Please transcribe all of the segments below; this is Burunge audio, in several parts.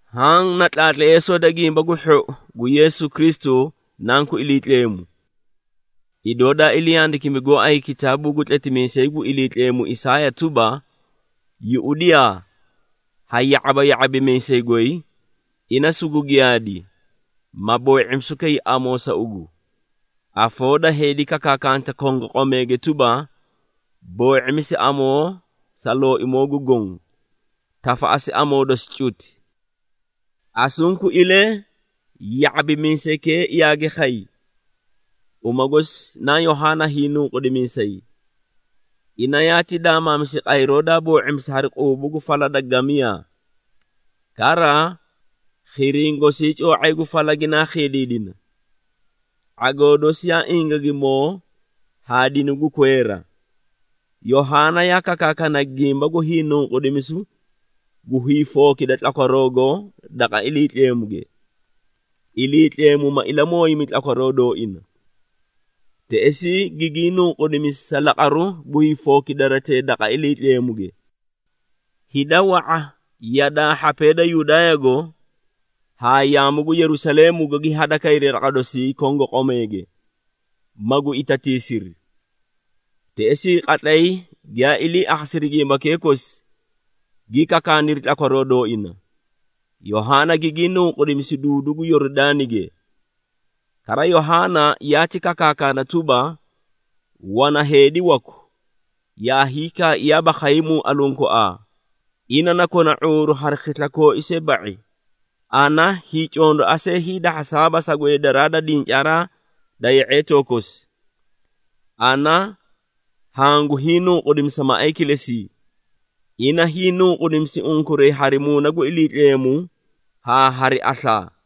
Haã na tlaatleesoo da Gimba gu Hhou gu Yeesu Kristu, Nanku Iliitleemu. Idoo daa ilii handikimi gooay kitaabuu gu tletimiisay gu Iliitleemu Isaaya tuba, “Yuꞌudiyaa, ha ya⁄aba ya⁄abimiisay goy, ina sugu giyaadi, ma boo⁄imisu kay amoo sa ugu. Afoo da heedi kakaakanta kongoqomeege tuba, ‘Boo⁄imisi amoo sa Looimoo gu Goõ, tafaꞌasi amoo dosi cuti!’” Asunkuilee ya⁄abimiisaykee yaagi khay, uma gosi naa Yohaana Hiinunqudimiisay. Ina yaati daamaamisi qayru daa boo⁄imisi hari quubu gu fala da gamiyaa. Kara, khiriĩ gosii coo⁄ay gu fala ginaa khiidiidina. ⁄agoo dosi yaa ingagimoo haa dinu gu kweera. Yohaana yaa kakaakana gimba gu hiinunqudimisu gu hiifookida tlakwaroogo daqa Iliitleemuge, Iliitleemu ma ilamooyimi tlakwaroo dooina. Teꞌesii gigii nunqudimisi sa laqaruu gu hiifookidaratee daqa Iliitleemuge. Hida wa⁄a yadaa hhapee da Yudaayago haa yaamu gu Yerusaleemugo gi hadakayri daqa dosii kongoqomeege, magu itatiisiri. Teꞌesii qatlay giyaa ilii akhasiri gimbakee kosi, gi kakaaniri tlakwaroo dooina, Yohaana gigii nunqudimisi duudu gu Yoridaanige. Kara Yohaana yaati kakaakana tuba, “Wana heedi waku, yaa hiikaaiyaaba khaymuu aluũ koaa, ina na kona ⁄uuru hari khisla kooi see ba⁄i, ana hiicondoa see hiidahhasaaba sa gweedaraa da dincaaraa da ye⁄eetoo kosi. Ana hangu hiinunqudiidimisa maꞌay kilesii. Ina hiinunqudimisi unkuray hari Muuna gu Iliitleemu haa hari aslaa.”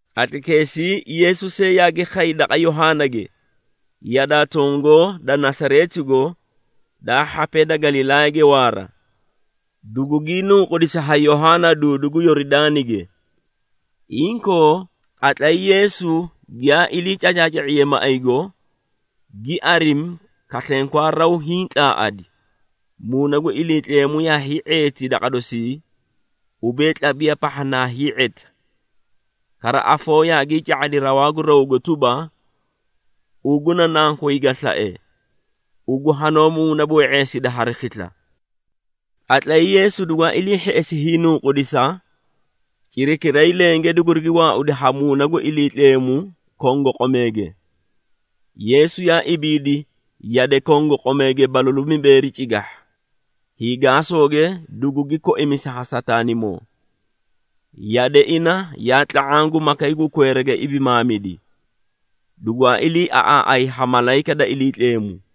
Qatlaykeesii Yeesu see yaagi khay daqa Yohaanage, yadaa tongoo da Nasareetigo daa hhapee da Galilaayage waara, dugugii nunqudisi ha Yohaana duudu gu Yoridaanige. Inkoo, qatlay Yeesu giyaa ilii cacaaca⁄iye maꞌaygo, gi arimi, kaslenkwaa, raw hiĩ tlaaꞌadi, Muuna gu Iliitleemu yaa hii⁄eeti daqa dosii, ubee, tlabiya pahha naa hii⁄eta. Kara afoo yaagii ca⁄adi rawaa gu rawgo tuba, “Ugu na Nankoy ga slae, ugu hanoó muunaboo⁄eesida hari khisla.” Qatlay Yeesu dugwaa ilii hheꞌesi hiinunqudisa, cirakiray lenge dugurigi waaudi ha Muuna gu Iliitleemu kongoqomeege. Yeesu yaa ibiidi yade kongoqomeege balalu mibeeri cigahha, hiigaasooge dugugi koimisi ha Sataanimoo. Yade ina yaa tla⁄aã gu makay gu kweerage ibimaamidi, dugwaa iliiaꞌaaꞌay ha malayika da Iliitleemu.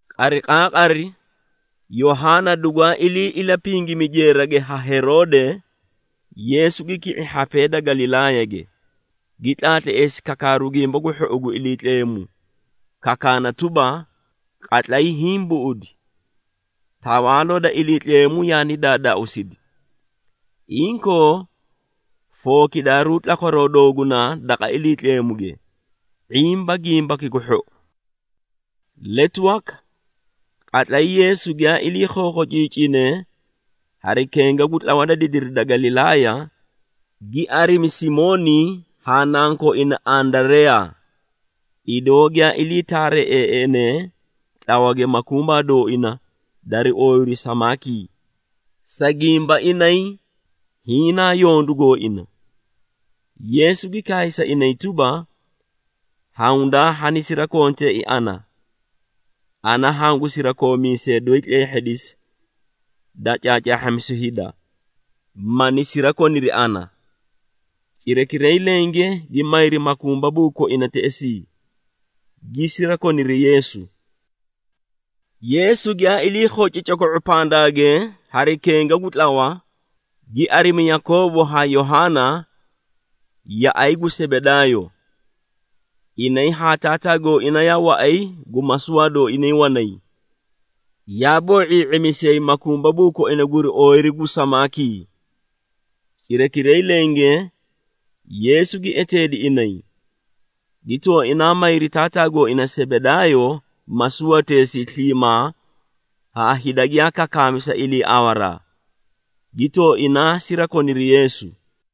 Qariqaaqari, Yohaana dugwaa ilii ilapingimi jeerage ha Heroode, Yeesu gi ki⁄i hhapee da Galilaayage, gi tlaatleesi kakaaru Gimba gu Hhou gu Iliitleemu, kakaana tuba, “Qatlay hiĩ buꞌudi, Tawaaloo da Iliitleemu yaani daadaausidi. Inkoo, fookidaaruu tlakwaroo doogunaa daqa Iliitleemuge, ⁄imba Gimbaki gu Hhou.” Letu waka, qatlay Yeesu giyaa ilii khookhociicine hari kenga gu tlawa da didiri da Galilaaya, gi arimi Simooni haa nankooina Andareyaa, idoo giyaa ilii taareeꞌeeꞌenee tlawage makumbaa dooina dari ooyiru samaakii, sa gimba inay hiĩ naa yondu gooina. Yeesu gi kaay sa inay tuba, “Hawundaa hani sirakonteei ana. Ana hangu sirakoomiisee doyi tleehhidisa da caacaahhamisu hida, mani sirakoniri ana.” Cirakiray lenge gi mayri makumbabuu koina teꞌesii, gi sirakoniri Yeesu. Yeesu giyaa ilii khoci coko⁄o pandaage hari kenga gu tlawa, gi arimi Yakoobo haa Yohaana, yaꞌay gu Sebedaayo. Inay haa taataa gooina yaa waꞌay gu masuwaa dooinay wanay, yaa boo⁄ii⁄imisiyay makumbabuu koina guri ooyiru gu samaakii. Cirakiray lenge Yeesu gi eteedi inay, gi tooinaa mayri taataa gooina Sebedaayo masuwateesii sliimaa haa hida giyaa kakaami sa iliiawaraa, gi tooinaa sirakoniri Yeesu.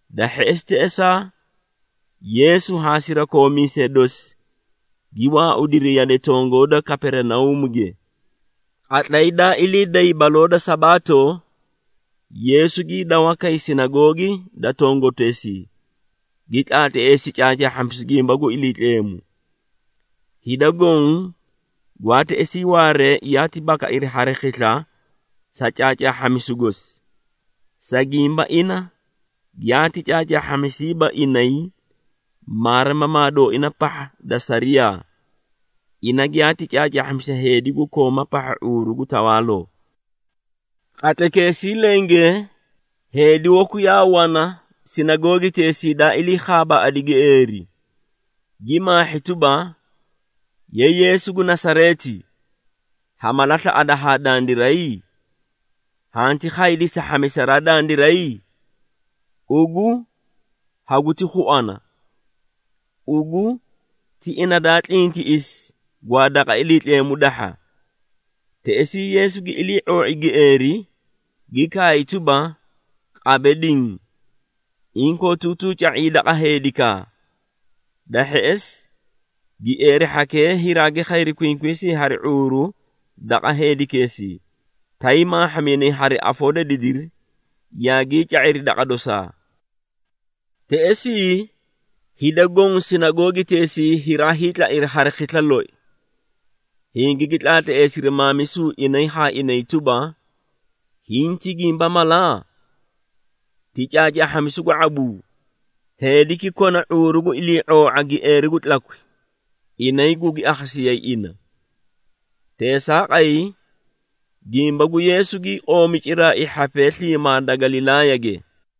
Da hheꞌesi teꞌesaa, Yeesu haa sirakoomiisee dosi gi waaudiri yade tongoo da Kaperinauumuge. Qatlay daa ilii day baloo da Sabaato, Yeesu gii dawa kay sinagoogi da tongoteesii, gi tlaatleesi caacaahhamisu gimba gu Iliitleemu. Hida goõ gwaa teꞌesii waaree yaati bakairi hari khisla sa caacaahhamisu gosi, sa gimba ina giyaati caacaahhamisiiba inay maarimamaa dooina pahha da sariyaa, ina giyaati caacaahhamisi heedi gu kooma pahha ⁄uuru gu tawaaloo. Qatlaykeesii lenge heedi waku yaa wana sinagoogiteesii daa ilii khaabaaꞌadi gieeri, gi maahhi, tuba, “Ye Yeesu gu Nasareeti, ha mala slaꞌada haa dandiray? Hanti khaydii sa hhamisaraa dandiray? Ugu, haguti khuana! Ugu ti ina daa tlintiꞌisi gwaa daqa Iliitleemu dahha.” Teꞌesii Yeesu gi ilii⁄oo⁄i gieeri, gi kaay tuba, “Qabe diĩ! Inkootuutuu ca⁄ii daqa heedikaa!” Da hheꞌesi, gieeri hhakee hiraagi khayri kwinkwiisii hari ⁄uuru daqa heedikeesii, tay maahhaminay hari afoo da didiri, yaagii ca⁄iri daqa dosaa. Teꞌesii hida goõ sinagoogiteesii hiraa hiitlairi hari khisla loi, hingigi tlaatleesiri maamisu inay haa inay tuba, “Hiĩ ti gimba mala? Ti caacaahhamisu gu ⁄abuu? Heediki kona ⁄uuru gu ilii⁄oo⁄a gieeri gu tlakwi, inay gugi akhasiyayi ina.” Teesaaqay gimba gu Yeesu, gii qoomi ciraai hhapee sliimaa da Galilaayage.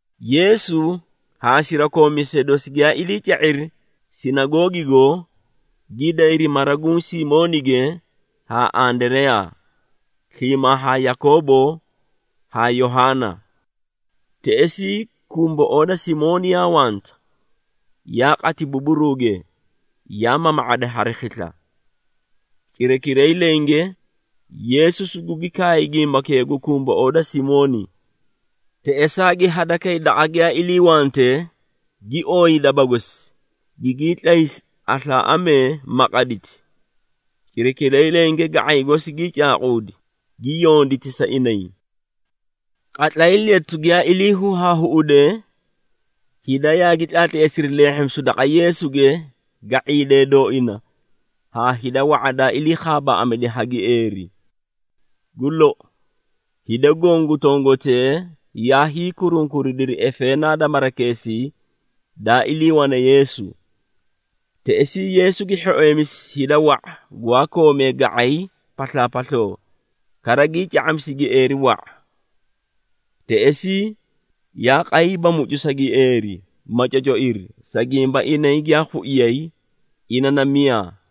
Yeesu haa sirakoomiisee dosi giyaa ilii ca⁄iri sinagoogigo, gi dayri mara guũ Simoonige haa Andareyaa, sliimaa haa Yakoobo haa Yohaana. Teꞌesii kumboꞌoo da Simooni yaa wanta, yaa qati buburuuge, yaa mama⁄ada hari khisla. Cirakiray lenge Yeesu sugugi kaay gimbakee gu kumboꞌoo da Simooni. Teꞌesaa gi hadakay daqa giyaa iliiwante, gi ooyi daba gosi, gigii tlaysi aslaaꞌamee, ma qaditi. Cirakiray lenge ga⁄aykee kosi gii caaquudi, gi yonditi sa inay. Qatlay letu giyaa ilii huhaahuꞌude, hida yaagi tlaatleesiri leehhimisu daqa Yeesuge ga⁄iidee dooina haa hida wa⁄a daa ilii khaabaaꞌamidi ha gieeri. Gu lou, hida goõ gu tongotee yaa hiikurunkuridiri efeenaa da marakeesii daa iliiwane Yeesu. Teꞌesii Yeesu gi hhoeemisi hida wa⁄a gwaa koomee ga⁄ay paslaapasloo, kara gii ca⁄amisi gieeri wa⁄a. Teꞌesii yaa qayiiba mucu sa gieeri, ma cocoiri, sa gimba inay giyaa khuiyay ina na miyaa.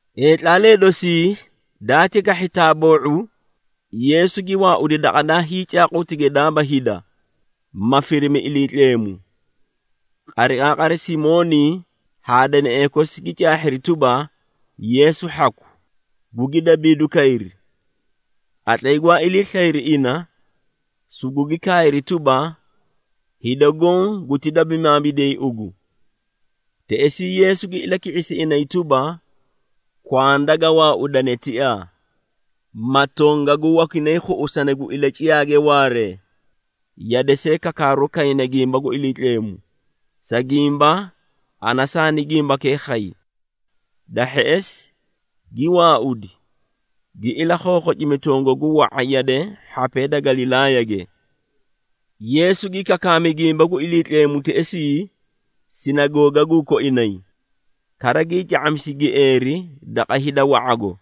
Heetlaalee dosii, daati kahhi taaboo⁄u, Yeesu gi waaudi daqa daa hiicaaqutige daaba hida, ma firimi Iliitleemu. Qariqaaqari Simooni haa deneꞌee kosi gi caahhiri tuba, Yeesu hhaku, gugi dabiiduu kayri. Qatlay gwaa ilii slayri ina, sugugi kaayri tuba, “Hida goõ guti dabimaamidiyay ugu!” Teꞌesii Yeesu gi ilaki⁄isi inay tuba, “Kwanda ga waaudane tiaa, ma tongagu wakinay khuꞌusani gu ilaciyaage waaree, yade see kakaaru kayna gimba gu Iliitleemu, sa gimba, ana saani gimbakee khay.” Da hheꞌesi, gi waaudi, gi ilakhookhocimi tongagu wa⁄a yade hhapee da Galilaayage. Yeesu gi kakaami gimba gu Iliitleemu teꞌesii sinagoogaguu koinay, kara gii ca⁄amisi gieeri daqa hida wa⁄ago.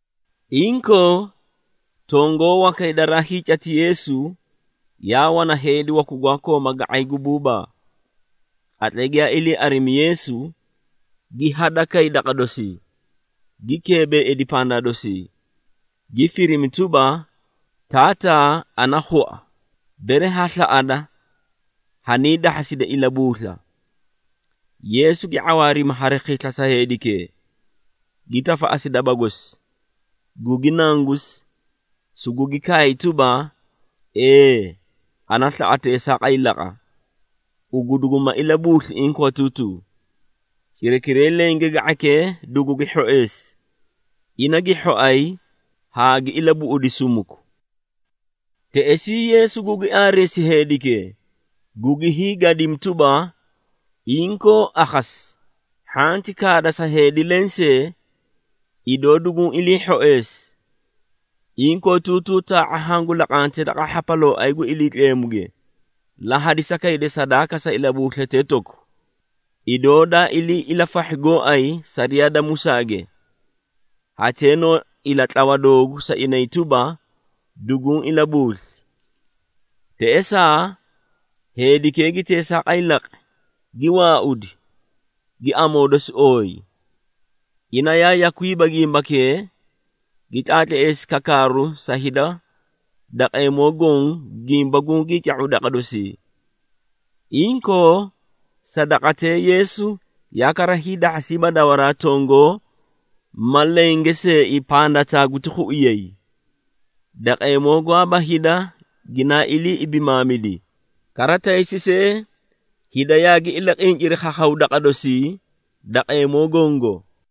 Inkoo, tongoo wakay daraa hiicati Yeesu, yaa wana heedi waku gwaa kooma ga⁄ay gu buubaa. Qatlay giyaa ilii arimi Yeesu, gi hadakay daqa dosii, gi keebeeidi pandaa dosii, gi firimi tuba, “Taataa, ana khua, bere ha slaꞌada, haniidahhasida ilabuusla.” Yeesu gi ⁄awaarimi hari khisla sa heedikee, gi tafaꞌasi daba gosi, gugi nangusi, sugugi kaay tuba, “Ee, ana slaꞌa teesaaqay laqa, ugu duguma ilabuusli inkootuutuu.” Cirakiray lenge ga⁄aykee dugugi hhoeesi, ina gi hhoay haa gi ilabuꞌudi sumuku! Teꞌesii Yeesu gugi aareesi heedikee, gugi hiigadimi, tuba, “Inkoo akhasi, hhanti kaada sa heedi lensee, idoo duguũ ilii hhoeesi. Inkootuutuu taa⁄a hangu laqante daqa hhapalooay gu Iliitleemuge, la hadisa kayda sadaaka sa ilabuuslatee toku, idoo daa ilii ilafahhi gooay sariyaa da Musaage. Hatee noo ilatlawa doogu sa inay tuba, duguũ ilabuusli.” Teꞌesaa, heedikee gi teesaaqay laqi, gi waaudi, gi amoo dosi ooyi. Ina yaa yakwiiba gimbakee, gi tlaatleesi kakaaru sa hida daqeemoo goõ gimba gungii ca⁄u daqa dosii. Inkoo sa daqatee Yeesu yaa kara hiidahhasiiba dawaraa tongoo ma lenge seei pandataa guti khuiyay. Daqeemoo gwaaba hida ginaa ilii ibimaamidi, kara taysi see hida yaagi ilaqinciri khakhaw daqa dosii daqeemoo gongo.